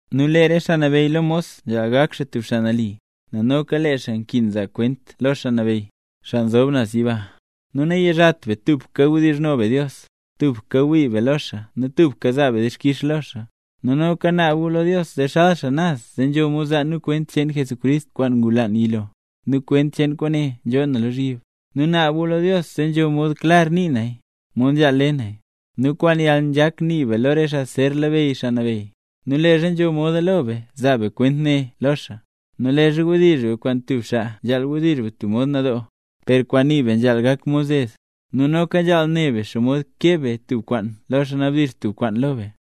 Nu lee re xaa nabeyy lo mos nzhaal gak xaa tub xaa nali, nel noka lee xaa nkin zaa kwent lo Xaa Nabeyy, xaa nzob naz yiba. Nu nayizhat be tubka wdizhno be Dios, tubka wii be lo xaa nu tubka zaa be dixkix lo xaa. Nu noka naab gu lo Dios zee xal xaa naz zee nzho mod zaa nu kwent cheen Jesucrist kwaan ngulaan yilo, nu kwent cheen kwaane nzhoo na lozhyib. Nu naab gu lo Dios zee nzho mod klar nii naya, mod nzhaal le naya. Nu kwaan yalnzhak nii be lo re xaa zer labeyy Xaa Nabeyy, nu leezha nzho moda lo be zaa be kwent ne lo xaa. Nu leezha wdizh be kwaan tub xaa nzhaal wdizh be tub mod nadoo, per kwaan nii be nzhaal gak mod zed, nu noka nzhaal ne be xomod keb be tub kwaan lo xaa nabdizh tub kwaan lo be.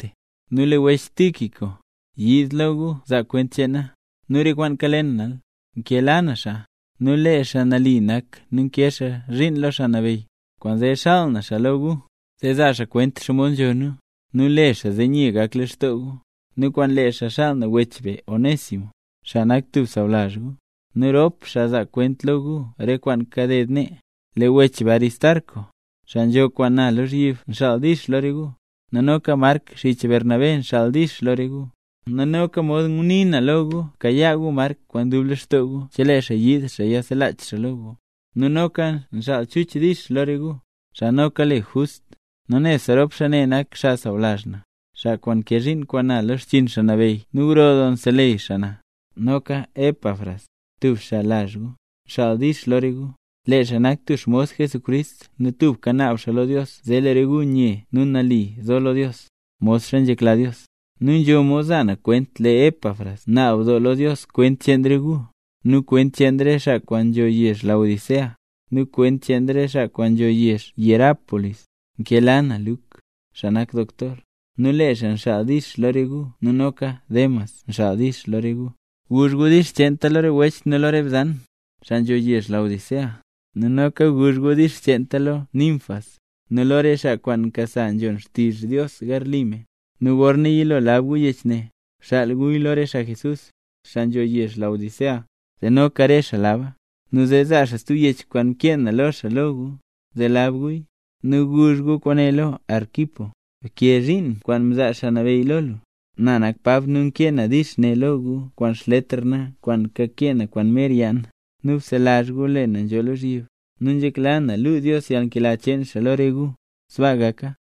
Nu lee wech be Tíquico, yiid lo gu zaa kwent cheen na, nu re kwaan kale na. Nkela na xaa, nu lee xaa nali nak nu nkee xaa zhiin lo Xaa Nabeyy. Kwaanzee nxaal na xaa lo gu, zee zaa xaa kwent xomod nzho nu, nu le xaa zee nye gak lextoo gu. Nu kwaan lee xaa nxaal na wech be Onésimo, xaa nak tub sawlazh gu. Rop xaa zaa kwent lo gu re kwaan kaded nee. Lee wech be Aristarco, xaa nzho kwaan na lozhyib nxaal “dix” lo re gu. Nu noka Mark xich Bernabé nxaal “dix” lo re gu, nu mod ngunii na lo gu bkayaa gu Mark kwaan dub lextoo gu chelee xaa yiid xaa yiselach xaa lo gu. Nu noka nxaal Chuch “dix” lo re gu, xaa noka le Just. Nu nebse rop xaa ne nak xaa sawlazh na, xaa kwaan nkee zhiin kwaan na lo xchiin Xaa Nabeyy nu gro doo nseleyy xaa na. Noka Epafras, tub xaa lazh gu, nxaal “dix” lo re gu. Lee xaa nak tub xmos Jesucrist nu tubka naab xaa lo Dios zee lee re gu nye nu nali nzo lo Dios, modxa nzhekla Dios. Nu nzho mod za na kwent, lee Epafras naab doo lo Dios kwent cheen re gu, nu kwent cheen re xaa kwaan nzho yezh Laodicea, nu kwent cheen re xaa kwaan nzho yezh Hierápolis. Nkela na Luk, xaa nak doktor, nu lee xaa nxaal “dix” lo re gu nu noka Demas nxaal “dix” lo re gu. Guzh gu “dix” cheenta lo re wech nu lo re bzan, xaa nzho yezh Laodicea. Nu noka guzh gu “dix” cheenta lo Ninfas, nu lo re xaa kwaan nkasa nzhon xtizh Dios garli me. Nu gorna yilo lab gu yech ne, bxaal guya lo re xaa Jesús, xaa nzho yezh Laodicea, zee noka re xaa laba; nu zee zaa xaa stub yech kwaan mkee na lo xaa lo gu, zee lab guya. Nu guzh gu kwaane lo Arquipo: “Bkee zhiin kwaan mzaa Xaa Nabeyy lo lu”. Na nak Pab, nu nkee na “dix” ne lo gu kwaan xletr na kwaan kakee na kwaan mer yaa na. Nu bselazh gu lee na nzhoo lozhyib. Nu nzhekla na luu Dios yalnkela cheen xaa lo re gu. Sbaa gaka.